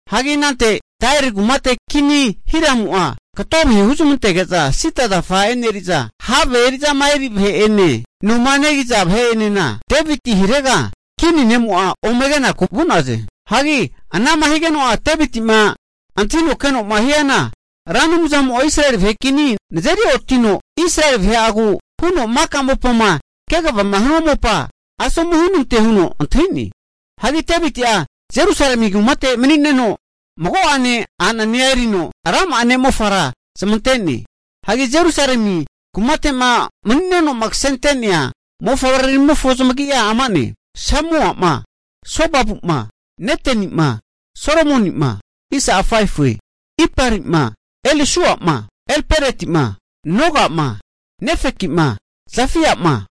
Hagi anante Tairi kumate kini ne' Hiramu'a kato vahe huzmantege'za sida zafa e'neriza, have eri'zama eri vahe'ene, noma negiza vahe'enena nezmavareno Deviti hirega kini noma'a ome kinaku vu'naze. Hagi ana'ma higeno'a Deviti'ma antahino keno'ma hiana Ra Anumzamo'a Israeli vahe' kini nazeri otino, Israeli vahe'agu huno maka mopama kegavama hanua mopa asomu hunante huno antahi'ne. Hagi Deviti'a Jerusalemi kumate mani'neno mago'ane a'nanea erino rama'a ne'mofara zamante'ne. Hagi Jerusalemi kumate'ma mani'nenoma kasente'nea mofavreramimofo zamagi'a ama'ne, Samuama, Sobabuma, Netenima, Solomonima, Iparima, Elisuama, Elpeletima, Nogama, Nefekima, Jafiama,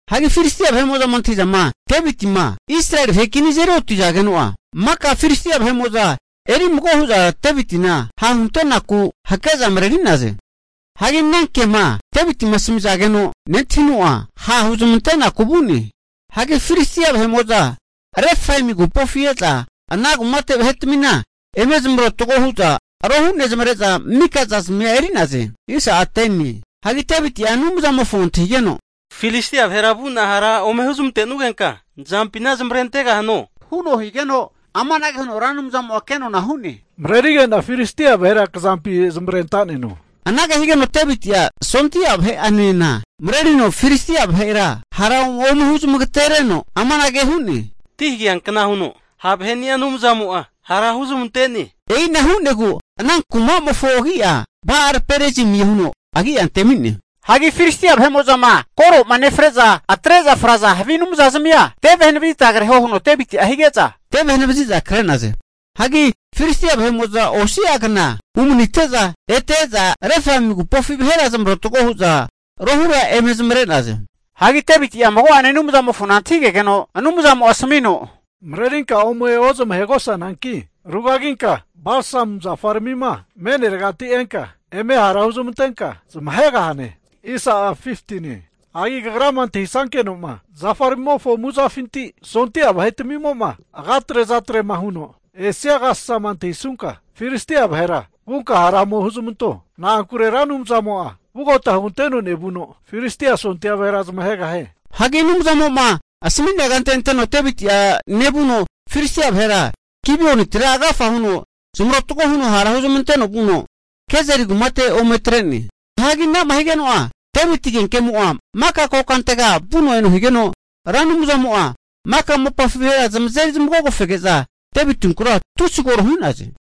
Hagi Filistia vahe'mo'zama antahi'zama, Devitima Israeli vahe kinima azeri otizageno'a, maka Filistia vahe'mo'za erimago hu'za Devitina hahunte'naku hake'za mareri'naze. Hianagi ana kema Devitima asamizageno nentahino, ha' huzmante'naku vu'ne. Hagi Filistia vahe'mo'za Refaimi agupofi e'za ana kumate vahetmina eme zamarotgo hu'za rohu nezamare'za mika zazmia eri'naze. Hagi Deviti'a Anumzamofo antahigeno, Filistia vahera vu'na hara ome huzmantenugenka, nzampina zamavarentegahano? Huno higeno amanage huno Ra Anumzamo'a kenona hu'ne, Marerige'na Filistia vahera kazampi zamavarentaneno. Anage higeno Deviti'a sondia vahe'anena marerino Filistia vahera hara ome huzamagatereno amanage hu'ne, Ti hageankna huno ha' vahe'nia Anumzamo'a hara huzmante'ne. E'ina hu'negu ana kuma'mofo agi'a Ba'al Perazimie huno agi'a antemi'ne. Hagi Filistia vahe'mo'zama koroma nefre'za atre'za fraza havi anumzazimia, teve hanavazita kreho huno Deviti'a hige'za, teve hanavaziza kre'naze. Hagi Filistia vahe'mo'za osi'a kna umanite'za ete e'za Refaim agupofi vahera zamaratgo hu'za rohura eme zamare'naze. Hagi Deviti'a mago'ane Anumzamofona antahigegeno, Anumzamo'a asamino, marerinka ome ozmahegosananki, rugaginka balsamu zafaramima me'neregati enka eme hara huzmantenka zamahegahane. Hagi kagrama antahisankeno'ma zafaramimofo amuzafima sondia vahetamimo'ma agatre azatrema huno esia agasasama antahisunka, Filistia vahera vunka hara ome huzamanto. Na'ankure Anumzamo'a vugota huganteno nevuno, Filistia sondia vahera zamahegahie. Hagi Anumzamo'ma asami'nea kante anteno Deviti'a nevuno Filistia vahera Gibionitira agafa huno zamarotgo huno hara huzmanteno vuno, Gezeri kumate ome atre'ne. Hagi ana'ma higeno'a Deviti agenkemo'a maka kokantega vuno eno higeno, Ra Anumzamo'a maka mopafi vahera zamazeri zamagogofege'za Devitinkura tusi koro hu'naze.